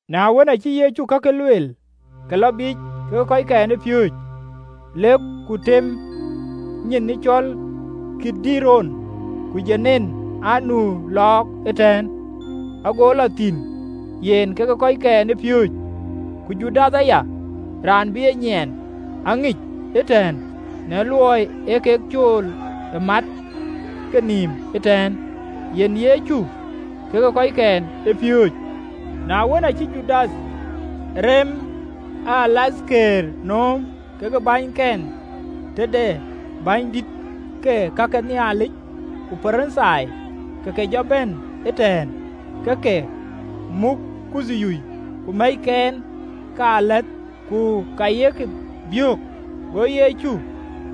Na wën, aacï Yecu kakë lueel, ke lɔ biic kekë kɔckɛn ë piööcë, lek ku temkï nyin cɔl Kidron, ku dom anu lɔɔk ëtɛ̈ɛ̈n, ago lɔ thïn, yen kekë kɔckɛn ë piööcë. Ku Judath aya, raan bï e nyiɛɛn, aŋic ëtɛ̈ɛ̈n: në luɔi ee kek cool e mat kenïïm ëtɛ̈ɛ̈n, yen Yecu kekë kɔckɛn ë piööcë. Na wën, aacï Judath rem ë alathkëër nööm kekë bänyken, tëde bänydït ke ka ke Nhialic ku Parithai, ke ke jɔ bɛ̈n ëtɛ̈ɛ̈n, ke ke muk kuthyuui ku mɛ̈ckealath ku ka ye ke biök. Go Yecu,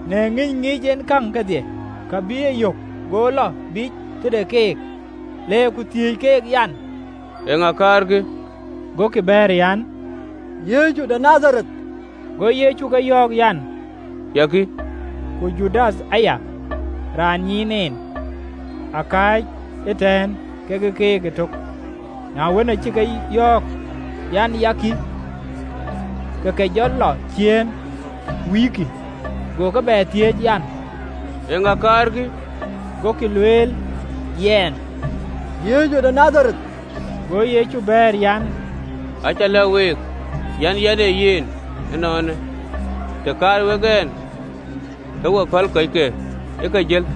në ŋïny ŋic en käŋ kedhie ka bï yök, go lɔ biic tëde keek, le ku thiëëc keek an, “Eeŋa kaarkï?” Gokï bɛ̈ɛ̈r an, “Yecu de Nadhareth.” Go Yecu ke yɔ̈ɔ̈k an, “Ya kï.” Ku Judath aya, raan ë nyiin en, akääc ëtɛ̈ɛ̈n kekë keek ëtök. Na wën, aacï ke yɔ̈ɔ̈k an, “Ya kï,” ke ke jɔ lɔ ciëën, wïïkï. Go ke bɛ thiëëc an, “Eeŋa kaarkï?” Gokï lueel an, “Yecu de Nadhareth.” Go Yecu bɛ̈ɛ̈r an, “Acä lɛ̈k week an, ee yɛn ee yen: ënɔɔnë, të kaar wek ɛn, ke we päl kɔckë ë ke jël.”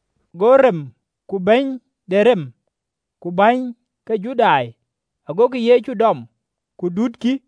Go rem ku bɛ̈ny de rem ku bäny ke Judai agokï Yecu dɔm, ku dutkï,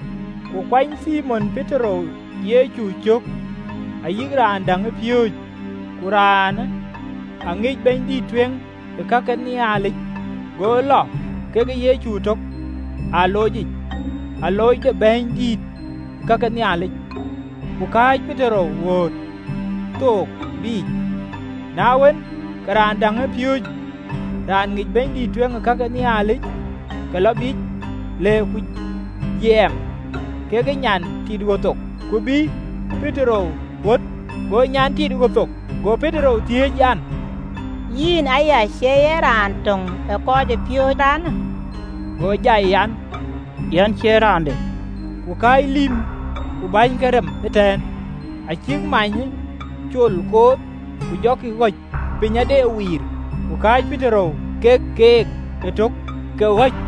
Ku kuany Thimon Petero Yecu cök, ayï raan däŋ ë piööcë. Ku raanë aŋic bɛ̈nydïït ë kake Nhialic, go lɔ kekë Yecu ëtök ë aloocic, alooc de bɛ̈nydïït ë kake Nhialic, ku kääc Petero ɣöt thok biic. Na wën, ke raan däŋ ë piööcë raan ŋic bɛ̈nydïït ë kake Nhialic, ke lɔ biic, le ku jiɛɛm kekë nyan lïm tit ɣöt thok, ku bïï Petero ɣöt. Go nyan lïm tit ɣöt thok go Petero thiëëc an, “Yïn aya, cï ye raan töŋ ë kɔcpiööcë raanë?” Go jai an, “Yɛn cie raande.” Ku kääc lïïm ku bäny ke rem ëtɛ̈ɛ̈n, acïk many ë cool kooth, ku jɔkï ɣɔ̈c, piny aa de wiir: ku kääc Petero ke keek ëtök, ke ɣɔ̈c.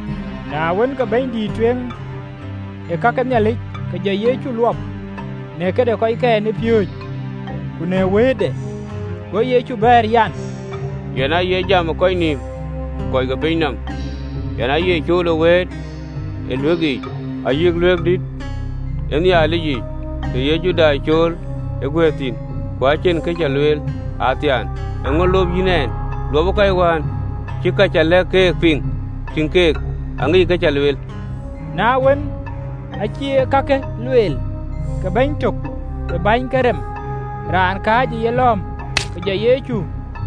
Na wën, ke bɛ̈nydïït ë kake Nhialic ke jɔ Yecu luɔp në këde kɔckɛn ë piööcë, ku në wëëtde. Go Yecu bɛ̈ɛ̈r an, “Yɛn aaye jam ë kɔc nïïm kɔc ke piny nɔm, yɛn aaye cool ë wëët ë ɣööt ke Nhialic yiic, ayï Luaŋdïtic, të ye Judai cool ë guëër thïn, ku acïn kë cä lueel athiaan. Eeŋö lop yïn ɛn? Luɔpë kɔc wään cï ka cä lɛ̈k keek piŋ? Tïŋ, keek aŋickï kë cä lueel.” Na wën, aacï ee kakë lueel, ke bɛ̈ny tök ë bäny ke rem, raan kääc ë yelɔ̈ɔ̈m, ke jɔ Yecu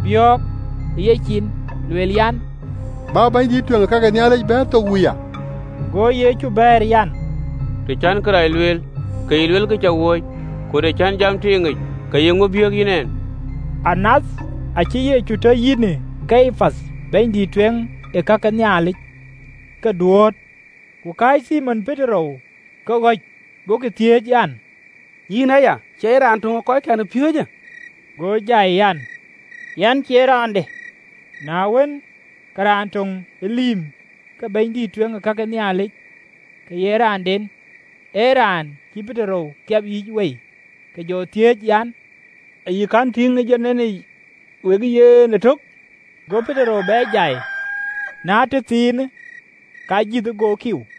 biɔ̈ɔ̈k ë yecin lueel an, “Bä bɛ̈nydïït ë kake Nhialic bɛ̈ɛ̈r thok wuya!” Go Yecu bɛ̈ɛ̈r an, “Të cän kërac lueel, ke yï luel kë cä wööc: ku të cän jam tiiŋic, ke ye ŋö biëëk yïn ɛn?” Anath acï Yecu tɔ yïnë Kayapath bɛ̈nydïït ë kake Nhialic ke duööt. Ku kääc Thimon Petero ke ɣɔ̈c. Gokï thiëëc an, “Yïn aya, cïï ye raan töŋ ë kɔckɛn ë piööcë?” Go jai an, “Yɛn cie raande.” Na wën, ke raan töŋ ë lïïm ke bɛ̈nydïït ë kake Nhialic, ke ye raanden ë raan cïï Petero kiɛp yïc wei, ke jɔ thiëëc an, “Ë yï kɛ̈n tïŋ domic wekë yen ëtök?” Go Petero bɛ jai: na tëthiinë ke ajïth go kiu.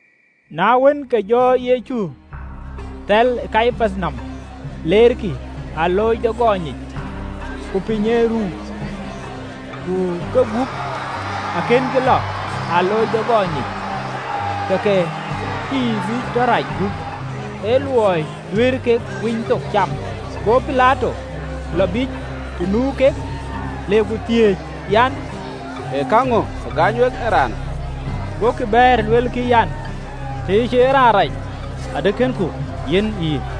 Na wën, ke ke jɔ Yecu thɛl ë Kayapath nɔm leerkï alooc de gɔny yic: ku piny ë ruu, ku kegup akënkï lɔ ë alooc de gɔny yic, ke ke cïï bï tɔ rac gup, ë luɔi duëër kek Winythok cam. Go Pilato lɔ biic të nu kek, le ku thiëëc an, “Ee käŋö ke gaany wek ee raanë?” Gokï bɛ̈ɛ̈r, luelkï an, “Tëë cïï ye raan rac, adï kënku yiɛ̈n yïn.”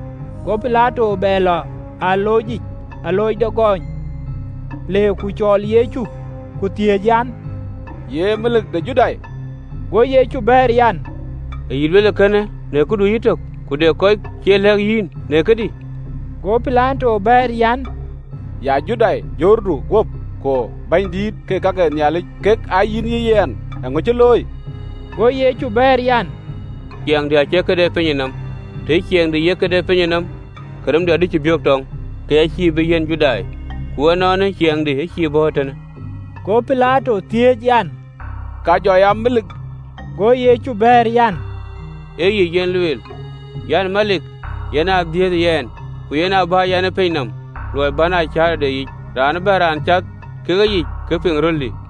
Go Pilato bɛ lɔ ë aloocic, alooc de gɔny, le ku cɔɔl Yecu, ku thiëëc an, “Ye melik de Judai?” Go Yecu bɛ̈ɛ̈r an, “Ë yï luel ee kënë në këdu yïtök, ku de kɔc kɔ̈k cï e lɛ̈k yïn në këdï?” Go Pilato bɛ̈ɛ̈r an, “Ya Judai? Jurdu guöp ku bänydït ke ka ke Nhialic kek aa yïn yï yɛn. Eeŋö cï looi?” Go Yecu bɛ̈ɛ̈r an, “Ciɛɛŋdï acie kë de pinyë nɔm, tëë ciɛɛŋdï ye kë de pinyë nɔm, ke remdï adï biök tɔŋ, ke ya cïï bï yiɛ̈n Judai, ku ënɔɔnë ciɛɛŋdï acïï bɔ̈ ee tënë!” Go Pilato thiëëc an, “Ka jɔ ya melik?” Go Yecu bɛ̈ɛ̈r an, “Ee yic yen luel, yɛn ee melik? Yen aa dhiëëthë yɛn, ku yen aa bä yɛn ë piny nɔm, luɔi bän aa cäätɔ de yic. Raan ëbɛ̈n raan cath ke yic ka piŋ röldï.”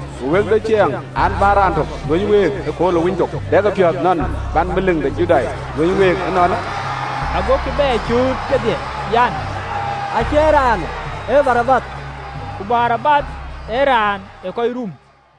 Ku wek de ciɛɛŋ an, bä raan tök luöny week ëkööl ë Winythok. Dɛkï piɔ̈ɔ̈th nɔn bän melik de Judai luöny week ënɔɔnë?” Agokï bɛ cööt kedhie an, “Acie raanë! Ee Barabath!” (Ku Barabath ee raan ee kɔc rum.)